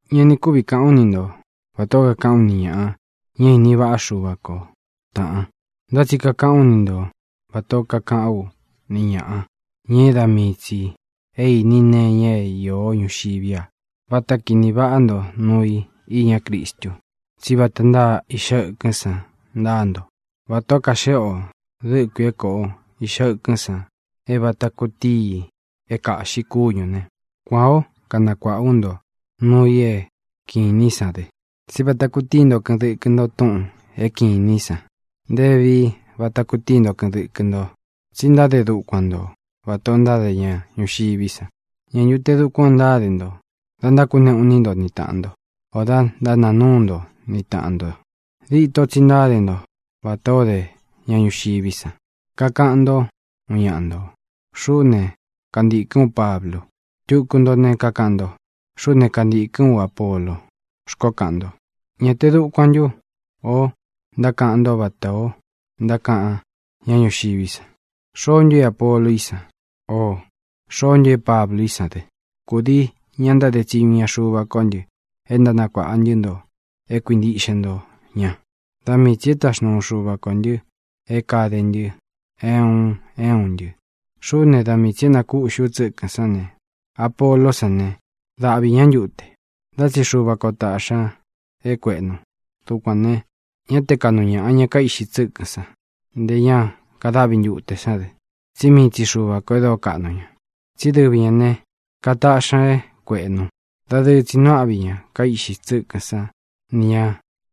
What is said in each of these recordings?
Ña ni kúvi kāꞌán u ni nto vatā ó kakaꞌán u ni ñāꞌa, ña é ini vaꞌá Xuva ko, tāꞌan. Ntá tsi kakaꞌán u ni nto vatā ó kakaꞌán u ni ñāꞌa, ña é da mii tsī é īni nee iña é īó ñuxiví a. Váta kīni váꞌa nto nuu i īñá Cristu, tsí vata ntáa iꞌxa ɨkɨ́n san ntáa nto. Vatā ó kaxéꞌe o dɨ̄kui é kōꞌo iꞌxa ɨkɨ́n san é vata kutíi i é kāꞌxi kúñū ne, kuān ó kanakuāꞌá u nto núu ī é kiꞌin īní san dɨ, tsí vata kutíi nto kɨꞌɨn dɨkɨ nto túꞌūn é kiꞌin īní san. Nté vevií vata kutíi nto kɨꞌɨn dɨkɨ nto, tsí ntáde dukuan nto vatā o ntáde ña ñuxiví san. ¿Ñā ntu te dukuan o ntáde nto da ntákuneꞌū iní nto ni tāꞌan nto, ō da ntánaa núu nto ni tāꞌan nto? Dito tsi ntáde nto vatā ó de ña ñuxiví san. Kakaꞌan ntó, uun ñaꞌa ntō: “Xuꞌú ne, kantīkɨ́n u Pablu.” Tuku nto ne, kakaꞌan nto: “Xuꞌú ne, kantīkɨ́n u Apolo”, xkoó kaꞌan nto. ¿Ñā te dukuan ntú o ntákaꞌan nto vatā o ntákaꞌan ñá ñuxiví san? ¿Xoó ntu é Apolo í san? ō ¿xoó ntu é Pablu í san dɨ? Kūdii ña ntáde tsiñu iña Xuva ko ntɨ e ntánakuāꞌa ntɨ́ nto é kuintiꞌxe nto ña. Da mii tsī e táxnuu Xuva kō ntɨ é kāde ntɨ, é un é un ntɨ. Xuꞌú ne, da mii tsī é nakūꞌxí u tsɨ́kɨ̄n sán ne, Apoló san ne, dáꞌvi ña ntūte. Ntá tsi Xuva kō táꞌxi ñā é kuēꞌnu. Dukuān ne, ñá te kāꞌnu ñaꞌa ña kaíꞌxi tsɨ́kɨ̄n san, nté ña kadáꞌvi ntute sán dɨ, tsí mii tsi Xuva kō e dóo kaꞌnu ña, tsi dɨ́vi ñā né, kataꞌxī ña é kuēꞌnu. Dadɨɨ tsi nuu áꞌvi ña kaíꞌxi tsɨ́kɨ̄n sán ni ñā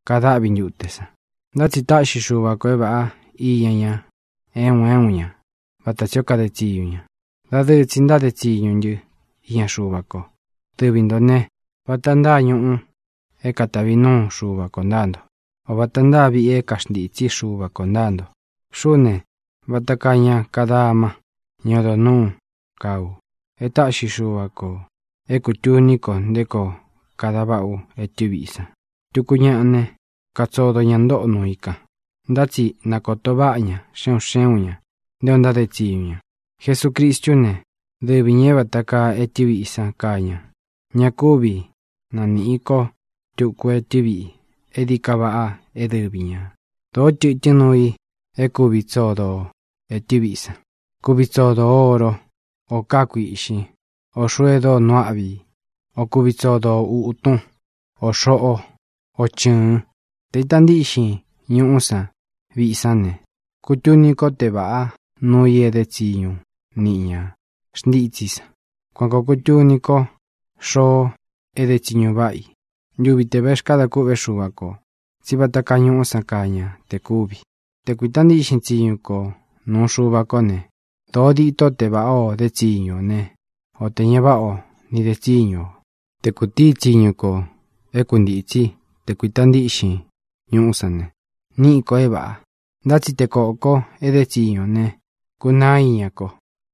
kadáꞌvi ntute san. Ntá tsi táꞌxi Xuva kō é vāꞌá iña ña, é un é un ña, vata tsī ó kade tsiñu ña. Dadɨɨ tsi ntáde tsiñu ntɨ́ iña Xuva ko. Dɨvi ntō né, vata ntáa ñuꞌu é katavi nuu Xuva kō ntáa nto. O vāta ntáa viꞌi é kaxntītsí Xuva kō ntáa nto. Xuꞌú ne, vata kaa ña kadama, ñá odo nūú, kaa ú, e táꞌxi Xuva kō é kutūní ko nté koo kada váꞌa ú etɨ́ viꞌi san. Tuku ñaꞌa ne, katsodo ña ntóꞌo nuu i kan. Ntá tsi na kōto váꞌa ña, xe un xé un ña, nté o ntáde tsiñu ña. Jesucristú ne, dɨvi ñā é vata kaa etɨ́ viꞌi san kaa ña. Ña kúvi nanīꞌi ko túku etɨ́ viꞌi é dií ka vaꞌa é dɨvi ñā. Dōó tɨtɨ́n nuu i é kuvi tsodo o ētɨ́ viꞌi san. Kuvi tsodo o ōró, ō kaá kuīꞌxín, o xūu e dóo nuu áꞌvi i, o kuvi tsodo o ūtún, ō xóꞌo, o chɨ̄ɨn. Tē ita ntíꞌxin ñuꞌú san viꞌi sán ne, kutuni ko te váꞌa nuu i e dé tsiñu niꞌi ña xntítsí i san. Kuan kōo kutuni ko xoo e dé tsiñu váꞌa i ntuvi te vexkáda kûꞌvé Xuva kō, tsí vata kaa ñuꞌú san kaa ña te kúvi. Te kuīta ntíꞌxin tsiñu ko nūu Xuva kó ne, dōo dîtó te vāꞌá o dé tsiñu ō né, o tē ña váꞌa o nī de tsíñu ō. Te kūtií tsiñu kō é kuntītsí te kuīta ntíꞌxin ñuꞌú san ne, níꞌi kō é vāꞌa. Ntá tsi te koko e dé tsiñu ō ne, kunaá iña ko.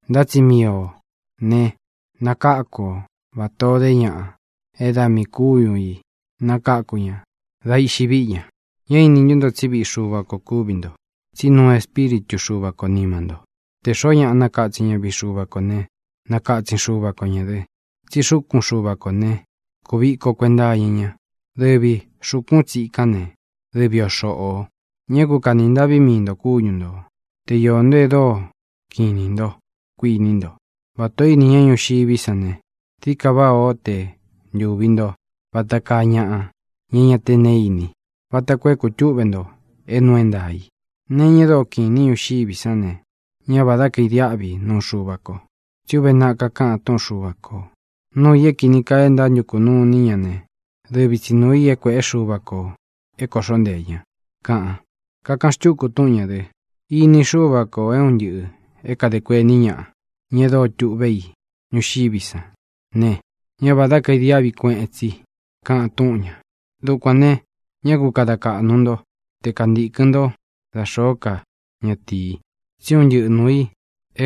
Ntá tsi mii ō ne, nakáku o vatā o dé ñaꞌa é da miī kúñu ī nakáku ña dá iꞌxi víꞌi ña. ¿Ñá īni ntú nto tsí viꞌi Xuva kō kúvi nto, tsí nuu Espíritu Xuva ko nīma nto? Te xōo ñáꞌa nakatsin ña viꞌi Xuva kō né, nakatsin Xuva ko ñā dɨ, tsí xúkun Xuva kō né, kūviko kuenta iña ña. Dɨvī xúkun tsīkán ne, dɨvi o xoꞌō. Ñá ku kāni ntaꞌví mii ntō kúñu ntō. Te iō nto e dóo kiꞌin inī ntó, kuiní nto, vatā ó ini ñá ñuxiví san ne, dií ka váꞌā ó te ntuvi nto vata kaa ñaꞌa, ña é ña te neé ini, vata koo é kūtúꞌve nto é nuu é ntaā i. Nee iña e dóo kiꞌin īní ñuxiví san ne, ñá vādá kaidiáꞌvi nuu Xuva ko. Tsí uve naꞌa kakaꞌan túꞌun Xuva kō: “Nuu i é kīni kaa e ntántukū nuní ña ne, dɨvi tsi nūu i é kuēꞌé Xuva kō é kōꞌxó nteē ña”, kaꞌan. Kakaꞌan xtúku túꞌun ñā dɨ: “Ini Xúva kō é un ntɨꞌɨ̄ é kadē kuení ñaꞌa, ña e dóo tuꞌvé i ñuxiví san ne, ñá vādá kaidiáꞌvi kueꞌen tsi”, kaꞌan túꞌun ñā. Dukuān ne, ñá ku kada kaꞌnu nto te kantīkɨn ntó dā xóo ká ñatīi, tsí un ntɨꞌɨ nuū i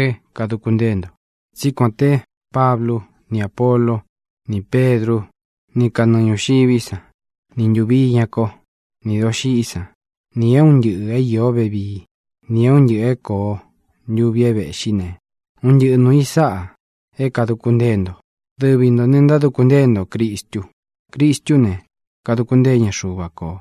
é kāduku ntée nto. Tsí kuān té Pablu, ni Apólo, nī Pedrú, ni kanɨɨ ñūxiví san, ni ntūvi iña kó, ni dōxiꞌi san, ni é un ntɨꞌɨ̄ é iō vevíi, nī é un ntɨꞌɨ̄ é kōo ntuvi é vēꞌxí ne, un ntɨꞌɨ nuū i sáꞌa é kāduku ntée nto. Dɨvi ntō ne, ntáduku ntée nto Cristu. Cristú ne, kaduku ntée ña Xuva kō.